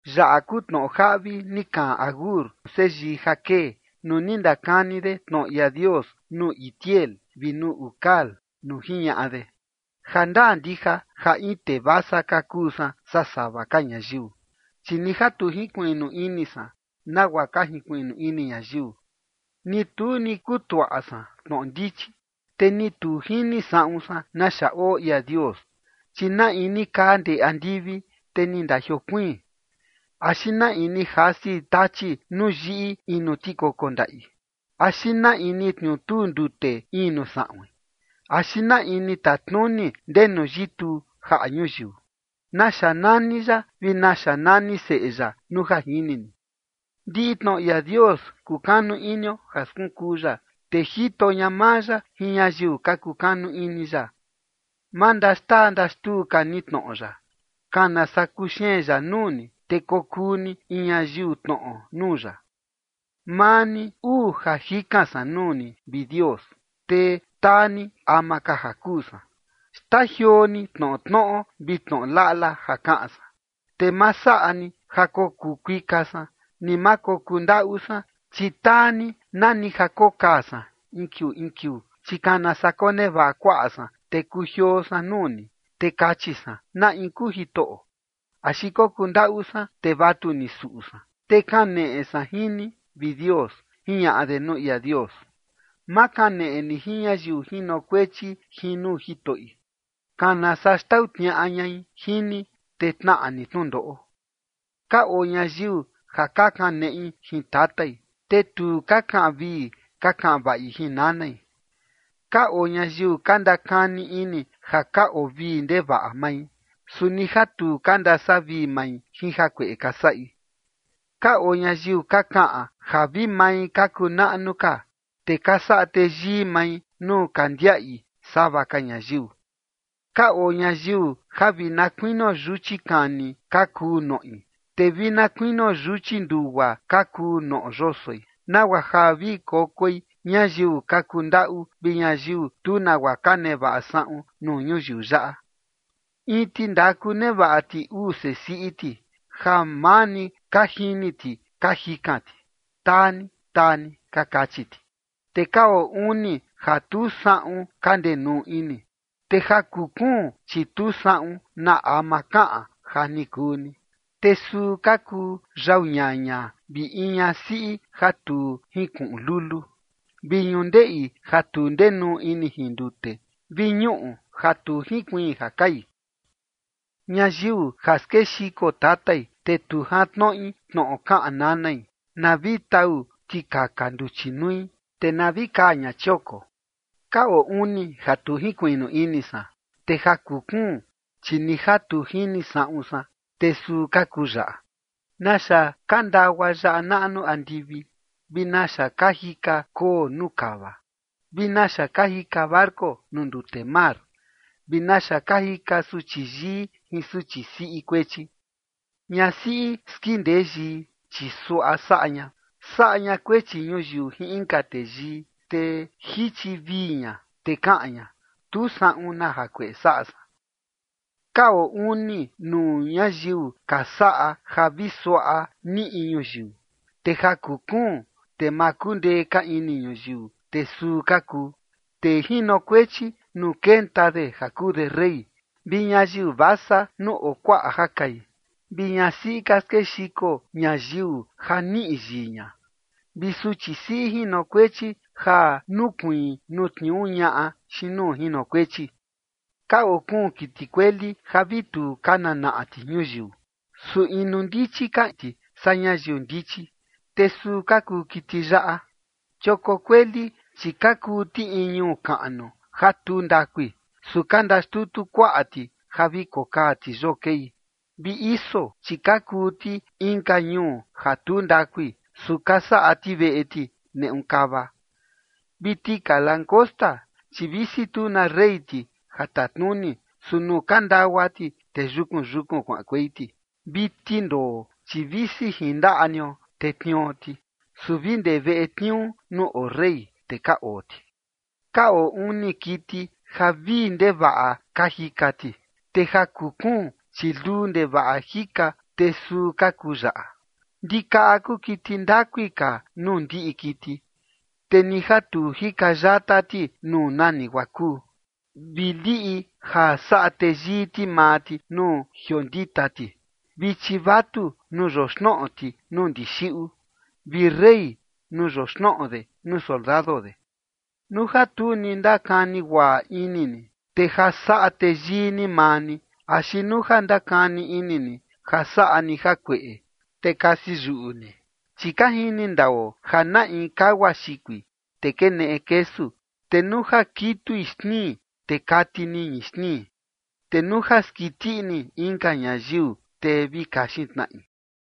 Yaꞌa kuu tnoꞌo jaꞌvi ni kaꞌan Agur, seyii Jaqué, nuu ni ndakani de tnoꞌo ia Dios nuu Itiel vi nuu Ucal, nuu jiñaꞌa de: Jandaa ndija ja in tee vasa ka kuu san saa sava ka ñayiu, chi ni ja tu jinkuiꞌnu ini san nagua ka jinkuiꞌnu ini ñayiu. Ni tu ni kutuaꞌa san tnoꞌo ndichi, te ni tu jini saꞌun san naxa oo ia Dios. ¿Chi na in ni kaa ndee andivi, te ni ndajiokuiin? ¿Axi na in ni jasi tachi nuu yiꞌi in nuu tikoko ndaꞌi? ¿Axi na in ni tniutuu ndute in nuu saꞌuin? ¿Axi na in ni tatnuni ndenu yituu jaꞌa ñuyiu? ¿Naxa nani ya, vi naxa nani seꞌe ya, nuu ja jini ni? Ndiꞌi tnoꞌo ia Dios kukanu inio ja skunkuu ya, te jito ña maa ya jin ñayiu ka kukanu ini ya. Ma ndaxtaa ndaxtuu ka ni tnoꞌo ya, kana saa kuxeen ya nuu ni, te kokuu ni in ñayiu tnoꞌo nuu ya. Maa ni uu ja jikan san nuu ni, vi Dios, te taa ni ama ka ja kuu san: Xtajioo ni tnoꞌo tnoꞌo vi tnoꞌo laꞌla ja kaꞌan san, te ma saꞌa ni ja kokuu kuika san, ni ma kokuu ndaꞌu san, chi taa ni nani ja kokaa san in kiuu in kiuu. Chi kana saa konevaꞌa kuaꞌa san, te kujioo san nuu ni, te kachi san: “¿Na in kuu Jitoꞌo?” Axi kokuu ndaꞌu san, te vatuni suꞌu san, te kaneꞌe san jin ni, vi Dios. Jiñaꞌa de nuu ia Dios. Ma kaneꞌe ni jin ñayiu jinokuechi jin nuu jitoꞌi, kana saa xtau tniaꞌa ñai jin ni, te tnaꞌa ni tnundoꞌo. Ka oo ñayiu ja ka kaneꞌi jin tatai, te tu ka kaꞌan vii ka kaꞌan vaꞌi jin nanai. Ka oo ñayiu ka ndakani ini ja ka oo vii ndevaꞌa mai, su ni ja tu ka ndasavii mai jin jakueꞌe ka saꞌi. Ka oo ñayiu ka kaꞌan ja vi mai ka kuu naꞌnu ka, te ka saꞌa teyii mai nuu ka ndiaꞌi sava ka ñayiu. Ka oo ñayiu ja vi na kuinio yuchi kani ka kuu noꞌi, te vi na kuinio yuchi ndugua ka kuu noꞌo yosoi, nagua ja vi kokoi ñayiu ka kundaꞌu vi ñayiu tu nagua ka nevaꞌa saꞌun nuu ñuyiu yaꞌa. In tindaku nevaꞌa ti uu sesiꞌi ti, ja maa ni ka jini ti ka jikan ti: “Taa ni, taa ni”, ka kachi ti. Te ka oo uni ja tu saꞌun ka ndenuu ini, te ja kuu kuun, chi tu saꞌun na ama kaꞌan: “Ja ni kuu ni”. Te suu ka kuu: Yau ñaña, vi in ñasiꞌi ja tu jinkuꞌun luluu, vi ñundeꞌi ja tu ndenuu ini jin ndute, vi ñuꞌu ja tu jinkuiin ja kai. Ñayiu ja skexiko tatai, te tu jantnoꞌi tnoꞌo kaꞌan nanai, na vi tau tikaka nduchi nui, te na vi kaa ña chioko. Ka oo uni ja tu jinkuiꞌnu ini san, te ja kuu kuun, chi ni ja tu jini saꞌun san, te suu ka kuu yaꞌa: Naxa ka ndagua yaꞌa naꞌnu andivi, vi naxa ka jika koo nuu kava, vi naxa ka jika barco nuu ndute mar, vi naxa ka jika suchi yii jin suchi siꞌi kuechi. Ñasiꞌi skindee yii, chi suaꞌa saꞌa ña: saꞌa ña kuechi ñuyiu jin inka teyii, te jichi vii ña, te kaꞌan ña: “Tu saꞌun na jakueꞌe saꞌa san”. Ka oo uni nuu ñayiu ka saꞌa ja vi suaꞌa niꞌi ñuyiu, te ja kuu kuun, te ma kundee ka ini ñuyiu, te suu ka kuu: tee jinokuechi nuu kenta de ja kuu de rey, vi ñayiu vasa nuu oo kuaꞌa ja kai, vi ñasiꞌi ka skexiko ñayiu ja ni niꞌi yii ña, vi suchi siꞌi jinokuechi ja nukuiin nuu tniuu ñaꞌa xiin nuu jinokuechi. Ka oo kuun kiti kueli ja vi tu ka nanaꞌa ti ñuyiu, su inu ndichi kaa ti saa ñayiu ndichi. Te suu ka kuu kiti yaꞌa: Chioko kueli, chi ka kuu ti in ñuu kaꞌnu ja tu ndakui, su ka ndaxtutu kuaꞌa ti ja vi kokaa ti yoo kei; vi iso, chi ka kuu ti inka ñuu ja tu ndakui, su ka saꞌa ti veꞌe ti neꞌu kava; vi tika langosta, chi visi tu na rey ti ja tatnuni, su nuu ka ndagua ti, te yukun yukun kuaꞌankuei ti; vi tindoo, chi visi jin ndaꞌa nio te tnio ti, su vi ndee veꞌe tniuu nuu oo rey, te ka oo ti. Ka oo uni kiti ja vii ndevaꞌa ka jika ti, te ja kuu kuun, chi luu ndevaꞌa jika, te suu ka kuu yaꞌa: Ndikaꞌa kuu kiti ndakui ka nuu ndiꞌi kiti, te ni ja tu jika yata ti nuu nani guaa kuu; vi liꞌi ja saꞌa teyii ti maa ti nuu jiondita ti, vi chivatu nuu yoxnoꞌo ti nuu ndixiꞌu, vi rey nuu yoxnoꞌo de nuu soldado de. Nuu ja tu ni ndakani guaꞌa ini ni, te ja saꞌa teyii ni maa ni, axi nuu ja ndakani ini ni ja saꞌa ni jakueꞌe, te kasi yuꞌu ni. Chi ka jini ndao ja na in kagua xikui, te keneꞌi kesu, te nuu ja kitui xnii, te kati niñi xnii, te nuu ja skiti ini inka ñayiu, te vi kaxin tnaꞌi.